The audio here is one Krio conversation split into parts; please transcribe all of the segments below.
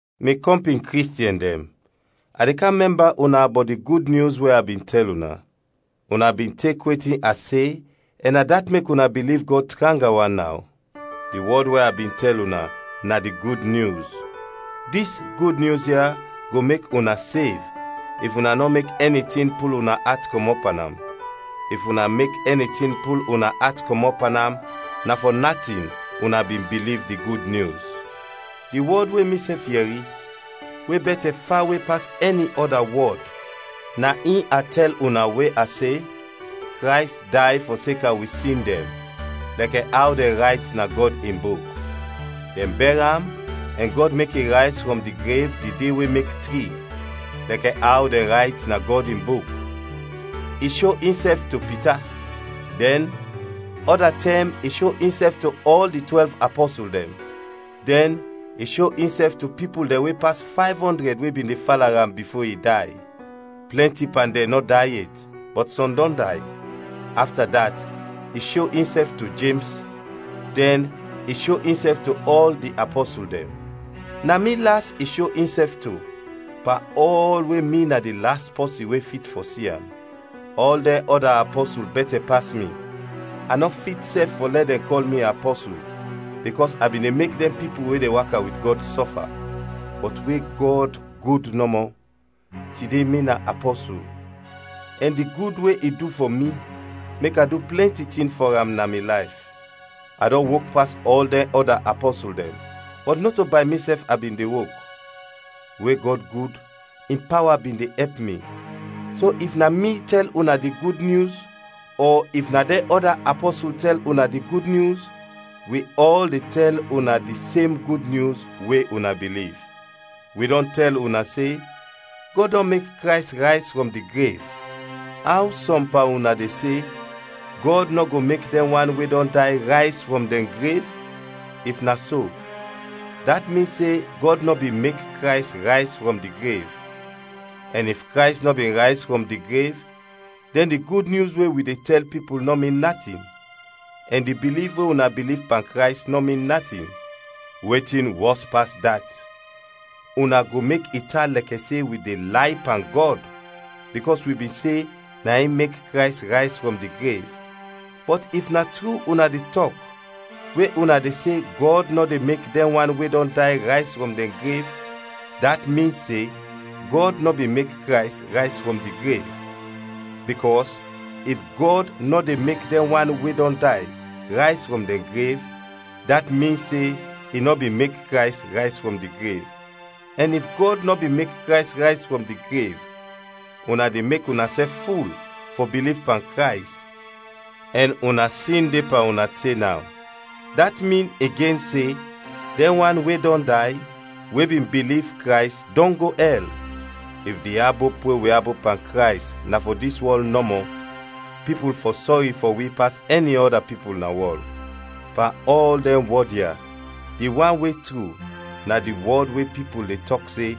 Mi kɔmpin Kristiɛn dɛn, a de kam mɛmba una bɔt di Gud Nyus we a bin tɛl una. Una bin tek wetin a se ɛn na dat mek una biliv Gɔd tranga wan naw. Di wɔd we a bin tɛl una, na di Gud Nyus. Dis Gud Nyus ya go mek una sev if una nɔ mek ɛni tin pul una at kɔmɔt pan am. If una mek ɛni tin pul una at kɔmɔt pan am na fɔ natin una bin biliv di Gud Nyus. Di wɔd we misɛf yɛri, we bɛtɛ fawe pas ɛni ɔda wɔd na in a tɛl una we a se: Krays day fɔseka wi sin dɛn, lɛkɛ aw dɛn rayt na Gɔd in Buk; dɛn bɛr am ɛn Gɔd mek i rayz frɔm di grev di de we mek tri, lɛkɛ aw dɛn rayt na Gɔd in Buk; i sho insɛf to Pita, dɛn, ɔda tɛm i sho insɛf to ɔl di twɛlv apɔsul dɛn. Dɛn i sho insɛf to pipul dɛn we pas fayv ɔndrɛd we bin de fala am bifo i day; plɛnti pan dɛn nɔ day yet, bɔt sɔm dɔn day. Afta dat, i sho insɛf to Jems, dɛn i sho insɛf to ɔl di apɔsul dɛn. Na mi las i sho insɛf to, pan ɔl we mi na di las pɔsin we fit fɔ si am. Ɔl dɛn ɔda apɔsul bɛtɛ pas mi; a nɔ fit sɛf fɔ lɛ dɛn kɔl mi apɔsul, bikɔs a bin de mek dɛn pipul we de waka wit Gɔd sɔfa. Bɔt we Gɔd gud nɔmɔ, tide mi na apɔsul, ɛn di gud we i du fɔ mi mek a du plɛnti tin fɔ am na mi layf. A dɔn wok pas ɔl dɛn ɔda apɔsul dɛn, bɔt nɔto bay misɛf a bin de wok; we Gɔd gud, in pawa bin de ɛp mi. So if na mi tɛl una di Gud Nyus ɔ if na dɛn ɔda apɔsul tɛl una di Gud Nyus, wi ɔl de tɛl una di sem Gud Nyus we una biliv. Wi dɔn tɛl una se Gɔd dɔn mek Krays rayz frɔm di grev, aw sɔm pan una de se, Gɔd nɔ go mek dɛn wan we dɔn day rayz frɔm dɛn grev? If na so, dat min se Gɔd nɔ bin mek Krays rayz frɔm di grev; ɛn if Krays nɔ bin rayz frɔm di grev, dɛn di Gud Nyus we wi de tɛl pipul nɔ min natin, ɛn di biliv we una biliv pan Krays nɔ min natin. Wetin wɔs pas dat, una go mek i tan lɛkɛ se wi de lay pan Gɔd, bikɔs wi bin se na in mek Krays rayz frɔm di grev; bɔt if na tru una de tɔk we una de se Gɔd nɔ de mek dɛn wan we dɔn day rayz frɔm dɛn grev, dat min se Gɔd nɔ bin mek Krays rayz frɔm di grev. Bikɔs if Gɔd nɔ de mek dɛn wan we dɔn day rayz frɔm dɛn grev, dat min se i nɔ bin mek Krays rayz frɔm di grev. Ɛn if Gɔd nɔ bin mek Krays rayz frɔm di grev, una de mek unasɛf ful fɔ biliv pan Krays ɛn una sin de pan una te naw. Dat min igen se dɛn wan we dɔn day, we bin biliv Krays, dɔn go ɛl. If di abop we wi abop pan Krays na fɔ dis wɔl nɔmɔ, pipul fɔ sɔri fɔ wi pas ɛni ɔda pipul na wɔl. Pan ɔl dɛn wɔd ya, di wan we tru, na di wɔd we pipul de tɔk se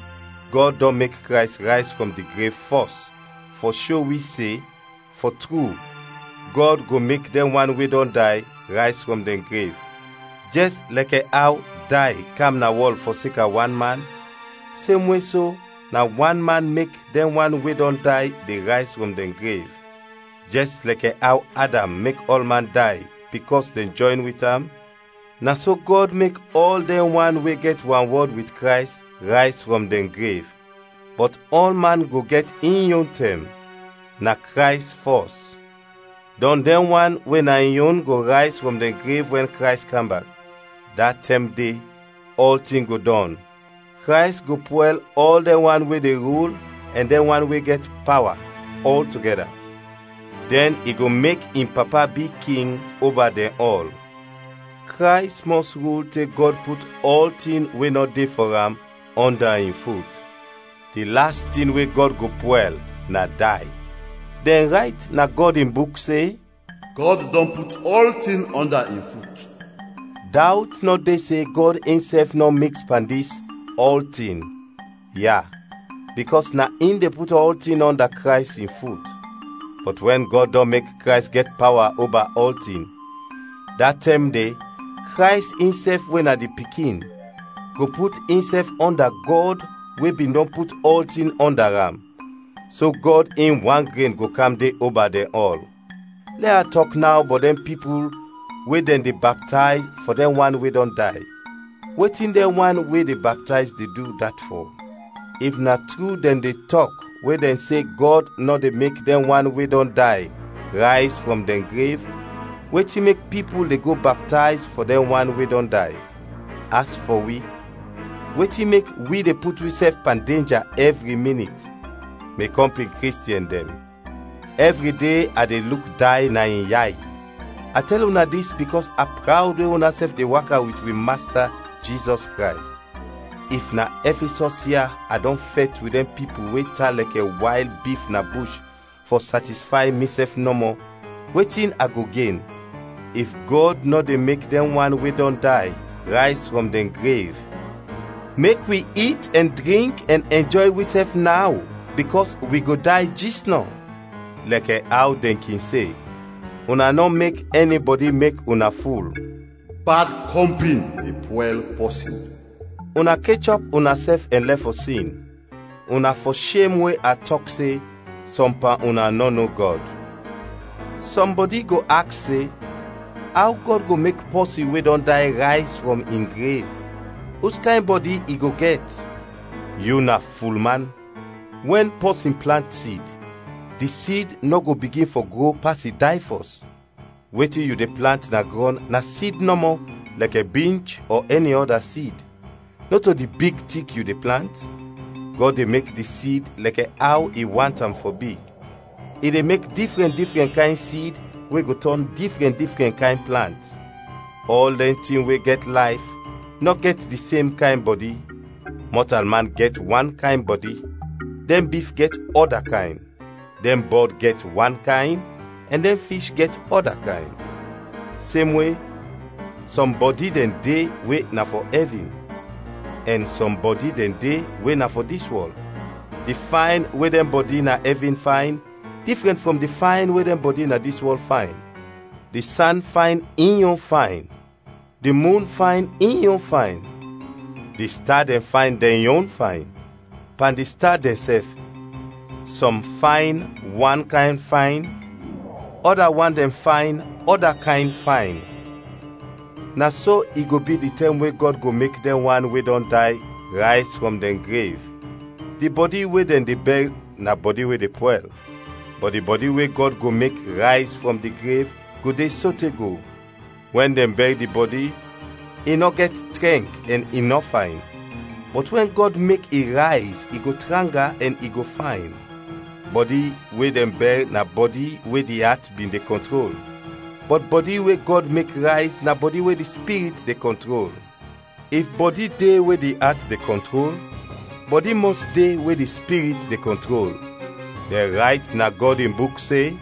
Gɔd dɔn mek Krays rayz frɔm di grev fɔs, fɔ sho wi se, fɔ tru, Gɔd go mek dɛn wan we dɔn day rayz frɔm dɛn grev. Jɛs lɛkɛ aw day kam na wɔl fɔseka wan man, semwe so, na wan man mek dɛn wan we dɔn day de rayz frɔm dɛn grev. Jɛs lɛkɛ aw Adam mek ɔlman day bikɔs dɛn jɔyn wit am, na so Gɔd mek ɔl dɛn we gɛt wanwɔd wit Krays rayz frɔm dɛn grev. Bɔt ɔlman go gɛt in yon tɛm: na Krays fɔs, dɔn dɛn wan we na in yon go rayz frɔm dɛn grev wɛn Krays kam bak. Da tɛm de ɔltin go dɔn; Krays go pwɛl ɔl dɛn wan we de rul ɛn dɛn wan we gɛt pawa, ɔltogɛda; dɛn i go mek in Papa bi King oba dɛn ɔl. Krays mɔs rul te Gɔd put ɔltin we nɔ de fɔ am, ɔnda in fut. Di las tin we Gɔd go pwɛl na day. Dɛn rayt na Gɔd in Buk se, “Gɔd dɔn put ɔltin ɔnda in fut.” Dawt nɔ de se Gɔd insɛf nɔ miks pan dis “ɔltin” ya, bikɔs na in de put ɔltin ɔnda Krays in fut. Bɔt wɛn Gɔd dɔn mek Krays gɛt pawa oba ɔltin, da tɛm de Krays insɛf we na di Pikin, go put insɛf ɔnda Gɔd we bin dɔn put ɔltin ɔnda am; so Gɔd in wan gren go kam de oba dɛn ɔl. Lɛ a tɔk naw bɔt dɛn pipul we dɛn de baptayz fɔ dɛn wan we dɔn day. Wetin dɛn wan we de baptayz de du dat fɔ? If na tru dɛn de tɔk we dɛn se Gɔd nɔ de mek dɛn wan we dɔn day rayz frɔm dɛn grev, wetin mek pipul de go baptayz fɔ dɛn wan we dɔn day? As fɔ wi, wetin mek wi de put wisɛf pan denja ɛvri minit? Mi kɔmpin Kristiɛn dɛn, ɛvri de a de luk day na in yay! A de tɛl una dis bikɔs a prawd we unasɛf de waka wit wi Masta Jizɔs Krays. If na Ɛfisɔs ya a dɔn fɛt wit dɛn pipul we tan lɛkɛ wayl bif na bush fɔ satisfay misɛf nɔmɔ, wetin a go gen? If Gɔd nɔ de mek dɛn wan we dɔn day rayz frɔm dɛn grev, “Mek wi it ɛn drink ɛn ɛnjɔy wisɛf naw, bikɔs wi go day jisnɔ,” lɛkɛ aw dɛn kin se. Una nɔ mek ɛnibɔdi mek una ful. “Bad kɔmpin de pwɛl pɔsin.” Una kechɔp unasɛf ɛn lɛf fɔ sin. Una fɔ shem we a tɔk se, sɔm pan una nɔ no Gɔd. Sɔmbɔdi go aks se, “Aw Gɔd go mek pɔsin we dɔn day rayz frɔm in grev? Uskayn bɔdi i go gɛt?” Yu na fulman! Wɛn pɔsin plant sid, di sid nɔ go bigin fɔ gro pas i day fɔs. Wetin yu de plant na grɔn na sid nɔmɔ lɛkɛ binch ɔ ɛni ɔda sid; nɔto di big tik yu de plant. Gɔd de mek di sid lɛkɛ aw i want am fɔ bi; i de mek difrɛn difrɛn kayn sid we go tɔn difrɛn difrɛn kayn plant. Ɔl dɛn tin we gɛt layf nɔ gɛt di sem kayn bɔdi; mɔtalman gɛt wan kayn bɔdi; dɛn bif gɛt ɔda kayn; dɛn bɔd gɛt wan kayn, ɛn dɛn fish gɛt ɔda kayn. Semwe, sɔm bɔdi dɛn de we na fɔ ɛvin, ɛn sɔm bɔdi dɛn de we na fɔ dis wɔl; di fayn we dɛn bɔdi na ɛvin fayn difrɛn frɔm di fayn we dɛn bɔdi na dis wɔl fayn. Di san fayn in yon fayn, di mun fayn in yon fayn, di sta dɛn fayn dɛn yon fayn; pan di sta dɛnsɛf, sɔm fayn wan kayn fayn, ɔda wan dɛn fayn ɔda kayn fayn. Na so i go bi di tɛm we Gɔd go mek dɛn wan we dɔn day rayz frɔm dɛn grev. Di bɔdi we dɛn de bɛr na bɔdi we de pwɛl; bɔt di bɔdi we Gɔd go mek rayz frɔm di grev, go de sote go. Wɛn dɛn bɛr di bɔdi, i nɔ gɛt trɛnk ɛn i nɔ fayn; bɔt wɛn Gɔd mek i rayz i go tranga ɛn i go fayn. Bɔdi we dɛn bɛr na bɔdi we di at bin de kɔntrol; bɔt bɔdi we Gɔd mek rayz na bɔdi we di Spirit de kɔntrol. If bɔdi de we di at de kɔntrol, bɔdi mɔs de we di Spirit de kɔntrol. Dɛn rayt na Gɔd in Buk se,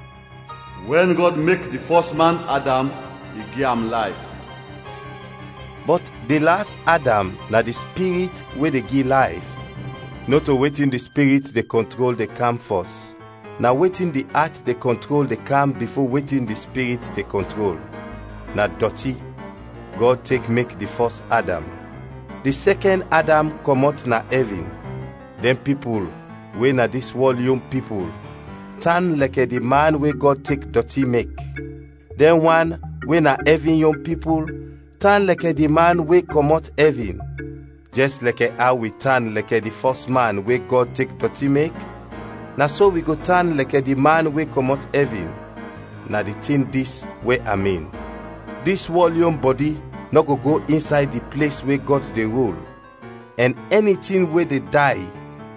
“Wɛn Gɔd mek di fɔs man, Adam, i gi am layf;” bɔt di las Adam na di Spirit we de gi layf. Nɔto wetin di Spirit de kɔntrol de kam fɔs, na wetin di at de kɔntrol de kam bifo wetin di Spirit de kɔntrol. Na dɔti, Gɔd tek mek di fɔs Adam; di sɛkɛn Adam kɔmɔt na ɛvin. Dɛn pipul we na dis wɔl yon pipul, tan lɛkɛ di man we Gɔd tek dɔti mek; dɛn wan we na ɛvin yon pipul tan lɛkɛ di Man we kɔmɔt ɛvin. Jɛs lɛkɛ aw wi tan lɛkɛ di fɔs man we Gɔd tek dɔti mek, na so wi go tan lɛkɛ di Man we kɔmɔt ɛvin. Na di tin dis we a min: Dis wɔl yon bɔdi nɔ go go insay di ples we Gɔd de rul, ɛn ɛni tin we de day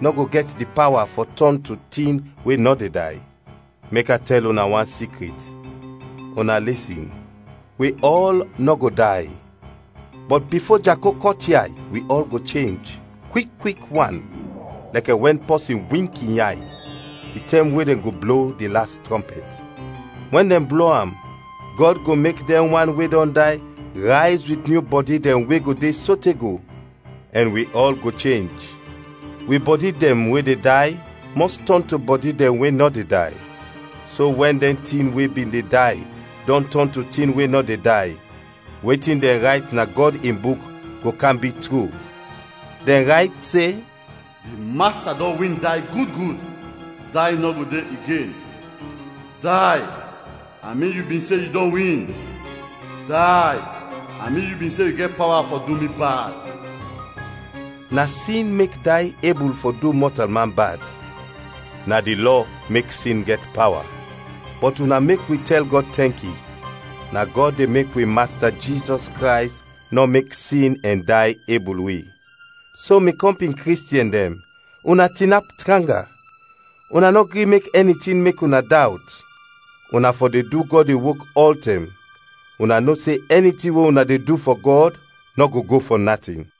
nɔ go gɛt di pawa fɔ tɔn to tin we nɔ de day. Mek a tɛl una wan sikrit, una lisin: Wi ɔl nɔ go day, bɔt bifo Jako kɔt yay wi ɔl go chenj, kwik kwik wan, lɛkɛ wɛn pɔsin wink in yay, di tɛm we dɛn go blo di las trɔmpɛt. Wɛn dɛn blo am, Gɔd go mek dɛn wan we dɔn day rayz wit nyu bɔdi dɛn we go de sote go, ɛn wi ɔl go chenj. Wi bɔdi dɛn we de day mɔs tɔn to bɔdi dɛn we nɔ de day; so wɛn dɛn tin we bin de day dɔn tɔn to tin we nɔ de day, wetin dɛn rayt na Gɔd in Buk go kam bi tru; dɛn rayt se: “Di Masta dɔn win day gud gud; day nɔ go de igen!” “Day, a min yu bin se yu dɔn win? Day, a min yu bin se yu gɛt pawa fɔ du mi bad?” Na sin mek day ebul fɔ du mɔtalman bad, na di Lɔ mek sin gɛt pawa. Bɔt una mek wi tɛl Gɔd tɛnki. Na Gɔd de mek wi Masta Jizɔs Krays nɔ mek sin ɛn day ebul wi. So, mi kɔmpin Kristiɛn dɛn, una tinap tranga, una nɔ gri mek ɛni tin mek una dawt. Una fɔ de du Gɔd in wok ɔltɛm, una no se ɛni tin we una de du fɔ Gɔd nɔ go go fɔ natin.